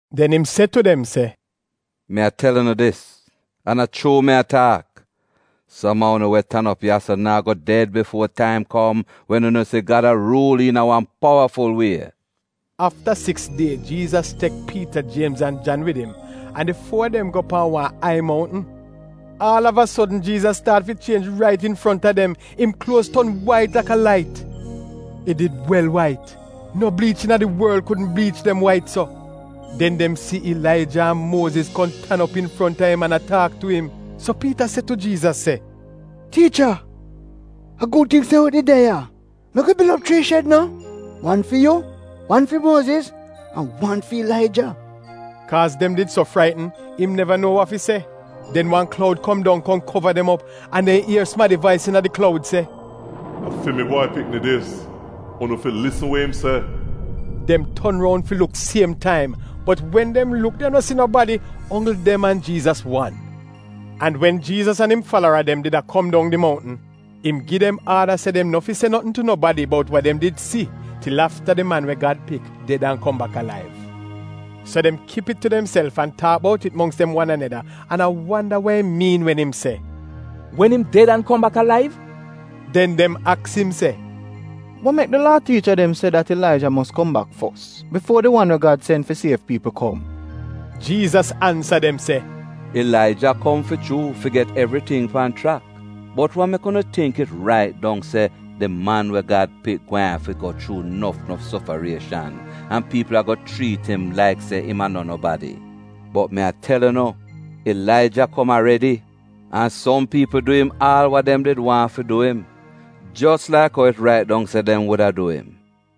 Den im se tu dem se, “Mi a tel unu dis, an a chuu mi a taak, som a unu we tan op ya-so naa go ded bifuo di taim kom wen unu si Gad a ruul iina wan powaful wie.” Afta siks die Jiizas tek Piita, Jiemz an Jan wid im an di fuo a dem wan go pan wan ai mountn. Aal av a sodn Jiizas staat fi chienj rait infronta dem, im kluoz ton wait laka lait. It did wel wait. No bliich iina di worl kudn bliich dem wait so. Den dem si Ilaija an Muoziz kom tan op infronta im an a taak tu im. So Piita se tu Jiizas se, “Tiicha, a gud ting se wi did de ya. Mek wi bil op chrii shed no — wan fi yu, wan fi Muoziz an wan fi Ilaija.” (Kaaz dem did so fraitn, im neva nuo wa fi se). Den wan kloud kom dong kom kova dem op an dem ier sumadi vais iina di kloud se, “A fi mi Bwai Pikni dis. Unu fi lisn wa im se!” Dem ton roun fi luk siem taim, bot wen dem luk dem no si nobadi, onggl dem an Jiizas wan. An wen Jiizas an im falara dem did a kom dong di mountn, im gi dem aada se dem nof fi se notn tu nobadi bout wa dem did si til afta di Man we Gad Pik ded an kom bak alaiv. So dem kip it tu demself an taak bout it mongks dem wan aneda an a wanda wa im miin wen im se, “Wen im ded an kom bak alaiv?” Den dem aks im “Wa mek di Laa tiicha dem se dat Ilaija mos kom bak fos bifuo di wan we Gad sen fi siev piipl kom?” Jiizas ansa dem se, “Ilaija kom fi chuu fi get evriting pan chrak. Bot wa mek unu tingk it rait dong se di Man we Gad Pik gweehn afi go chuu nof sofarieshan an piipl ago chriit im laik se im no nobadi? Bot mi a tel unu, Ilaija kom aredi, an som piipl du im aal wa dem did waahn fi du im, jos laik ou it rait dong se dem wuda du im.”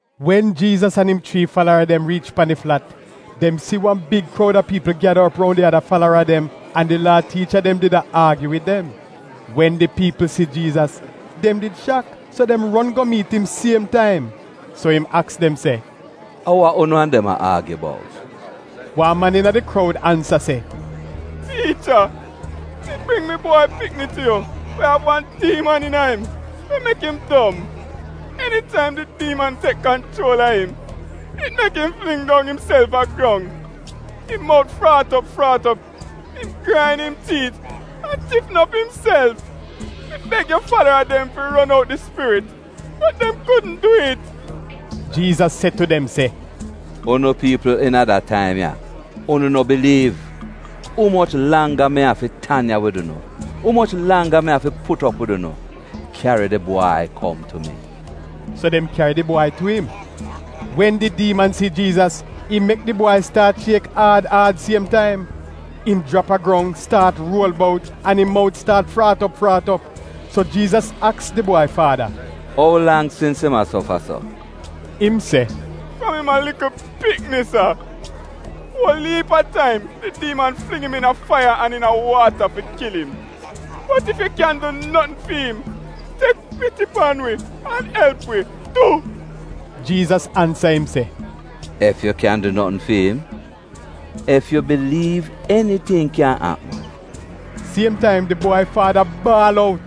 Wen Jiizas an im chrii falara dem riich pan di flat, dem si wan big kroud a piipl gyada op roun di ada falara dem, an di Laa tiicha dem did a aagyu wid dem. Wen di piipl si Jiizas, dem did shak, so dem ron go miit im siem taim. So im aks dem se, “Wa unu an dem a aagyu bout?” Wan man iina di kroud ansa se, “Tiicha, mi bring mi bwai pikni tu yu we av wan diiman iina im we mek im dom. Enitaim di diiman tek kanchuol a im, it mek im fling dong imself a grong, im mout fraat op fraat op, im grain im tiit an tifn op imself. Mi beg yu falara dem fi ron out di spirit, bot dem kudn dwi'it.” Jiizas se tu dem se, “Unu piipl iina da taim ya! Unu no biliiv! Umoch langga mi afi tan ya wid unu? Umoch langga mi afi put op wid unu? Kyari di bwai kom tu mi.” So dem kyari di bwai tu im. Wen di diiman si Jiizas, im mek di bwai staat shiek aad aad siem taim. Im jrap a grong, staat ruol bout, an im mout staat fraat op fraat op. So Jiizas aks di bwai faada, “Ou lang sins im a sofa so?” Im se, “Fram im a likl pikni sa. Uol iip a taim di diiman fling im iina faiya an iina waata fi kil im. Bot ef yu kyan du notn fi'im, tek piti pan wi an elp wi, du.” Jiizas ansa im se, “ ‘Ef yu kyan du notn fi'im?’ Ef yu biliiv eniting kyan apm.” Siem taim di bwai faada baal out,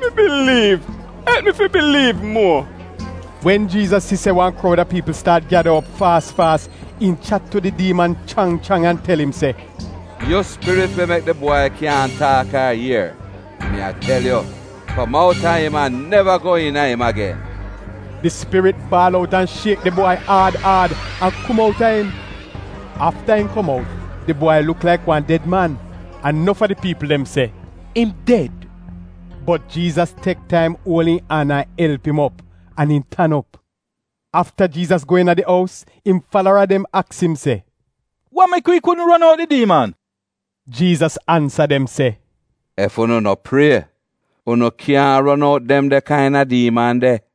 “Mi biliiv, elp mi fi biliiv muo!” Wen Jiizas si se wan kroud a piipl staat gyada op faas faas, im chat tu di diiman chrang chrang an tel im se, “Yu spirit we mek di bwai kyaahn taak ar ier, mi a tel yu, kom outa im an neva go iina im agen!” Di spirit baal out an shiek di bwai aad aad an kom outa im. Afta im kom out di bwai luk laik wan ded man an nof a di piipl dem se “Im ded!” Bot Jiizas tek taim uol im an an elp im op, an im tan op. Afta Jiizas go iina di ous, im falara dem aks im se, “Wa mek wi kudn ron out di diiman?” Jiizas ansa dem se, “Ef unu no prie, unu kyaahn ron out dem de kaina diiman de.”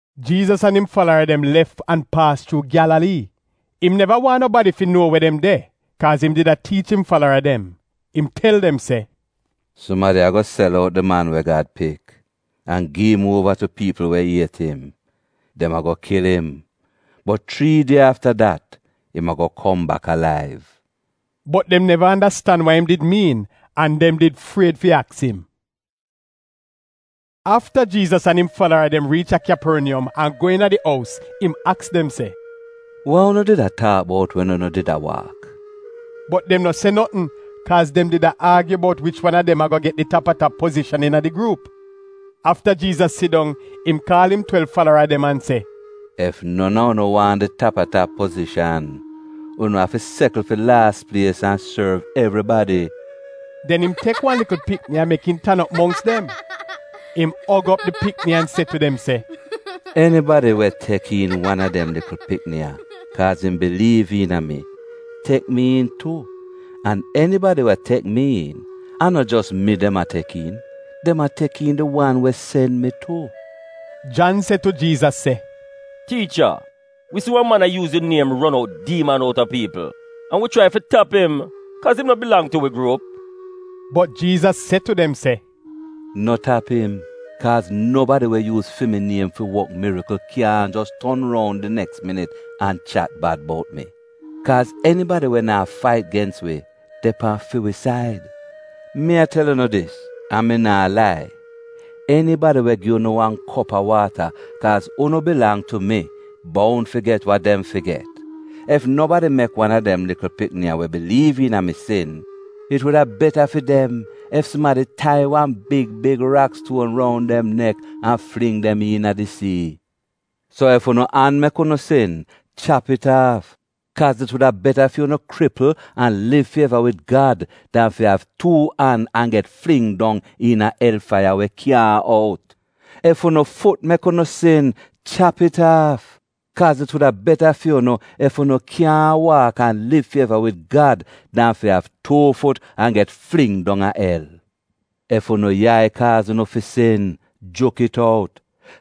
Jiizas an im falara dem lef an paas chuu Gyalalii. Im neva waahn nobadi fi nuo we dem de, kaaz im did a tiich im falara dem. Im tel dem se “Sumadi ago sel out Di Man we Gad Pik an gi im uova tu piipl we iet im. Dem ago kil im, bot chrii die afta dat, im ago kom bak alaiv.” Bot dem neva andastan wa im did miin, an dem did fried fi aks im. Afta Jiizas an im falara dem riich a Kyaporniyom an go iina di ous im aks dem se, “Wa unu did a taak bout wen unu did a waak?” Bot dem no se notn, kaaz dem did a aagyu bout wich wan a dem ago get di tap-a-tap pozishan iina di gruup. Afta Jiizas sidong, im kaal im twelv falara dem an se, “Ef non a unu waahn di tap-a-tap pozishan, unu a fi sekl fi laas plies an sorv evribadi.” Den im tek wan likl pikni an mek im tan op mongks dem. Im og op di pikni an se tu dem se, “Enibadi we tek iin wan a dem likl pikni ya kaaz im biliiv iina mi tek mi iin tu an enibadi we tek mi iin, a no jos mi dem a tek iin, dem a tek iin di wan we sen mi tu.” Jan se tu Jiizas se, “Tiicha, wi si wa man a yuuz yu niem ron out diiman outa piipl an wi chrai fi tap im kaaz im no bilang tu wi gruup.” Bot Jiizas se tu dem se, “No tap im, kaaz nobadi we yuuz fi mi niem fi wok mirikl kyaahn jos ton roun di neks minit an chat bad bout mi. Kaaz enibadi we naa fait gens wi de pan fi wi said. Mi a tel unu dis, an mi naa lai, enibadi we gi unu wan kop a waata kaaz unu bilang tu mi, boun fi get wa dem fi get.” “Ef nobadi mek wan a dem likl pikni ya we biliiv iina mi sin, it wuda beta fi dem ef sumadi tai wan big big rakstuon roun dem nek an fling dem iina di sii. So ef unu an mek unu sin, chap it aaf. Kaaz it wuda beta fi unu kripl an liv fi eva wid Gad dan fi av tuu an an get fling dong iina el faiya we kyaahn out! Ef unu fut mek unu sin, chap it aaf. Kaaz it wuda beta fi unu ef unu kyaahn waak an liv fi eva wid Gad dan fi av tuu fut an get fling dong a el. Ef unu yai kaaz unu fi sin, juk it out.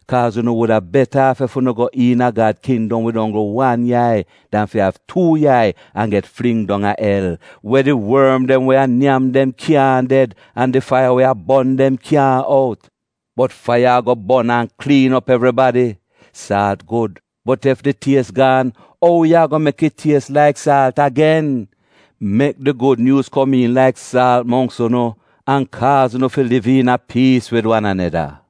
Kaaz unu wuda beta aaf ef unu go iina Gad kindom wid onggl wan yai dan fi av tuu yai an get fling dong a el, we “ ‘Di worm dem we a nyam dem kyaahn ded an di faiya we a bon dem kyaahn out.’ Bot faiya ago bon an kliin op evribadi. “Saalt gud, bot ef di ties gaan, ou yu ago mek it ties laik saalt agen? Mek di Gud Nyuuz komiin laik saalt mongks unu an kaaz unu fi liv iina piis wid wan aneda.”